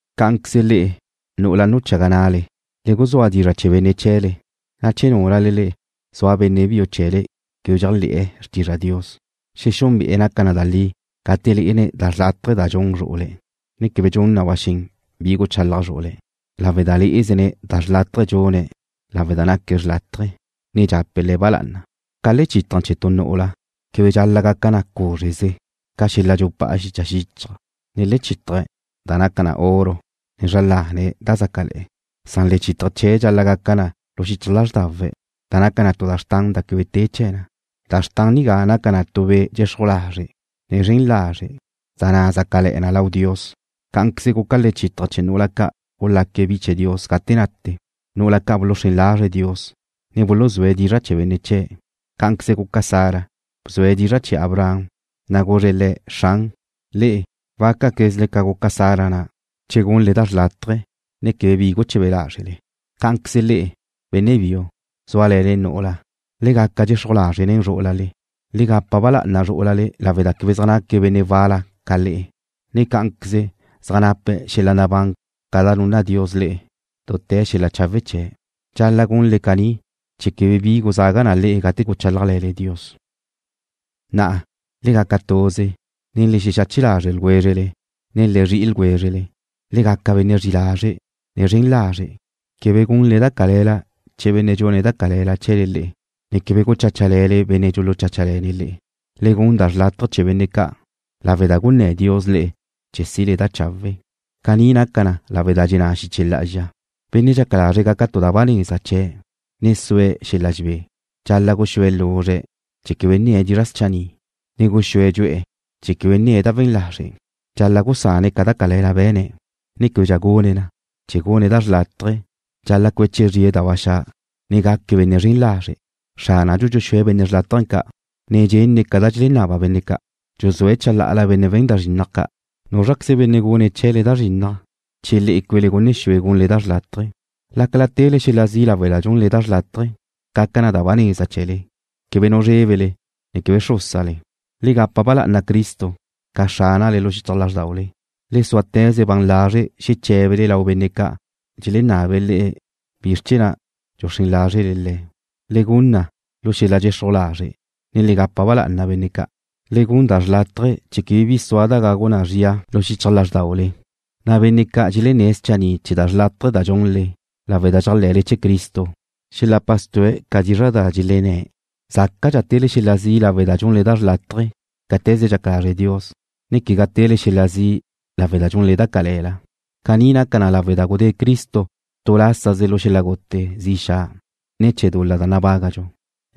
Cá'anqueze le'e, nu'ula nuchaga na'le, le guzúa dizra' chee̱ benne' chee̱le, na' che núlale zua benne' biu chee̱le quebe dxéajle̱'e̱ xrtizra Dios, xexúnbe'e̱ naca na da li gate lé'ene̱' da xrlátaje da dxun zru'ule̱', ne quebe gun na ba xen bi guchalaj zru'ule̱', lawe' da lé'ezene̱' da xrlátaje dxune̱' lawe' da naque̱' xrlátaje, ne dxape̱' le̱' ba lá'ana. Ca lechítaje̱ chee̱ tu nu'ula quebe dxal-la' gaca na cúzreze ca xel-la' dxupá'a xicha xíchaje̱', ne lechítaje̱ da naca na oro, ne zra lane̱' da zácale̱'e̱. Lechítaje̱ chee̱' dxal-la' gaca na lu xichaj lázrdawe', da naca na tu da xrtan da quebe te chee̱ na. Da xrtan nigá naca na tu be' dxexruj lazre', ne zren lazre', da na' zácale̱'e̱ na lau Dios. Cá'anqueze guca lechítaje̱ chee̱ nu'ula ca' gulaque̱' bi chee̱ Dios gate nate. Nu'ula ca' buluxrén lazre̱' Dios, ne buluzúe̱' dizra' chee̱ benne' chee̱'. Cá'anqueze guca Sara, bzue̱' dizra' chee̱ Abraham, na' guzre̱' le̱': “Xran.” Le'e wácaquezle ca guca Sara na' che gunle da xrlátaje, ne quebe bi guchebe lázrele. Cá'anqueze le'e, benne' biu, zúale̱le nu'ula, le gaca dxexruj lazre' nen zrú'ulale. Le gapa ba lá'ana zrú'ulale lawe' da quebe zaj naque̱' benne' wal-la ca le'e, ne cá'anqueze zaj nape̱' xel-la' nabán ca da nunna Dios le'e dute̱ xel-la' chawe' chee̱'. Dxal-la' gunle caní chee̱ quebe bi guzaga na le'e gate guchálajle̱le Dios. Na'a: Le gaca tuze Le xexache lazre' ljwézrele, ne le zri'i ljwézrele. Le gaca benne' zri'i lazre', ne zren lazre'. Quebe gunle da cale̱la chee̱ benne' dxune̱' chee̱le da cale̱la, ne quebe gucháchale̱le benne' dxulucháchale̱ne̱' le'e. Le gun da chawe' chee̱ benne' ca' lawe' da gunné̱' Dios le'e chee̱ sile da chawe'. Caní naca na lawe' da dxenná xiche lá'azxa: Benne' dxaca lazre̱' gaca tu da ba neza chee̱', ne sue̱' xel-la' dxebé dxal-la' guxúe̱' luzre' chee̱ quebe nne̱' dizra' schanni', ne guxúe̱' dxu'e̱ chee̱ quebe nne̱ na da we̱n lazre'. Dxal-la' gusane̱' ca da cale̱la be̱ne̱', ne québedxa gune̱' na, chee̱ gune̱' da chawe'. Dxal-la' cueche zrie̱' da ba xa', ne gaque̱' benne' zren lazre'. Xránadxu dxuxúe̱' benne' chawe' ca', ne dxenne̱' ca da dxelenaba benne' ca'. Dxuzúe̱' chalá'ala benne' we̱n da zrinnaj ca'. ¿Núzraqueze benne' gune̱' chee̱le da zrinnaj che le'e cuele gunne xue gunle da chawe'? Lácala tele xel-la' zi' lawe' da dxunle da chawe', gaca na da ba neza chee̱le. Quebe nu zrébele, ne quebe xrúsale. Le gapa ba lá'ana Cristo ca Xránale lu xichaj lázrdaule. Le súateze ban lazre' xeché̱bele lau benne' ca' dxelenabe̱' le'e bizr chee̱ na' dxuxrén lázrele Le̱'. Le gun na lu xel-la' dxexruj lazre', ne le gapa ba lá'ana benne' ca'. Le gun da chawe' chee̱ quebe bi sua da gagu na zria lu xichaj lázrdaule, na' benne' ca' dxelenné̱' schanni' chee̱ da chawe' da dxunle lawe' da dxéajle̱l-le chee̱ Cristo, xelapa stu'e̱ ca dizra' da dxelenné'. Zácadxa tele xel-la' zi' lawe' da dxunle da chawe' cáte̱ze dxaca lazre Dios, ne quegá tele xel-la' zi' lawe' da dxunle da cale̱la. Caní naca na lawe' da gudé Cristo tu lásaze lu xel-la' gute zi xa' ne̱ chee̱ dul-la da nabágadxu.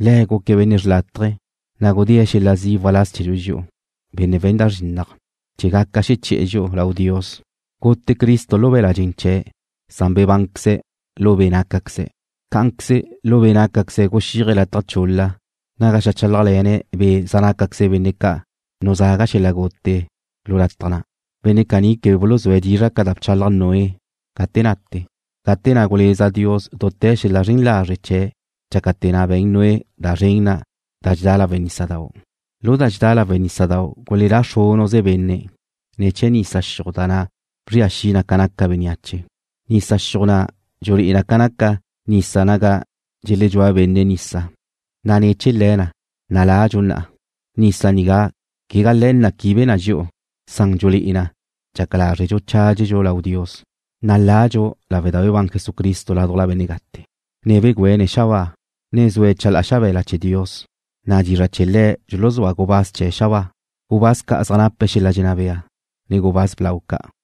Le̱' guque̱' benne' xrlátaje, na' gudée̱' xel-la' zi' waláz chee̱dxu dxi'u, benne' we̱n da zrinnaj, chee̱ gaca xeché̱'e̱ dxi'u lau Dios. Gute Cristo lu be̱l-la' dxen chee̱', san bebánqueze̱' lu be' nácaqueze̱'. Cá'anqueze lu be' nácaqueze̱' guxíaje̱' lataj chul-la naga xeajchálajle̱ne̱' be' zaj nácaqueze benne' ca' nuzaga xel-la' gute lu lataj na'. Benne' caní quebe buluzúe̱' dizra' ca da bchalaj Noé gate nate, gate na' guleza Dios dute̱ xel-la' zren lazre' chee̱' dxácate̱ na' be̱n Noé da zren na' da dxedá lawe' nísadau'. Lu da dxedá lawe' nísadau' gulelá xrúnuze benne' ne̱ chee̱ nisa xiuj da na' bzria xi na ca naca bénneache. Nisa xiuj na' dxulé'e na ca naca nisa naga dxelexedxúa benne' nisa, na' lu le̱ na' naladxu na'a. Nisa nigá quegá le̱ na' quibe na dxi'u, san dxulé'e na dxaca lázredxu chádxedxu lau Dios, na' ladxu lawe' da bebán Jesucristo ládujla benne' gate, ne begüene̱' xabáa, ne zue̱' chalá'a xabe̱la chee̱ Dios, na' dizra' chee̱ Le̱' dxuluzúa gubáz chee̱ xabáa, gubáz ca' zaj nape' xel-la' dxenná bea, ne gubáz blau ca'.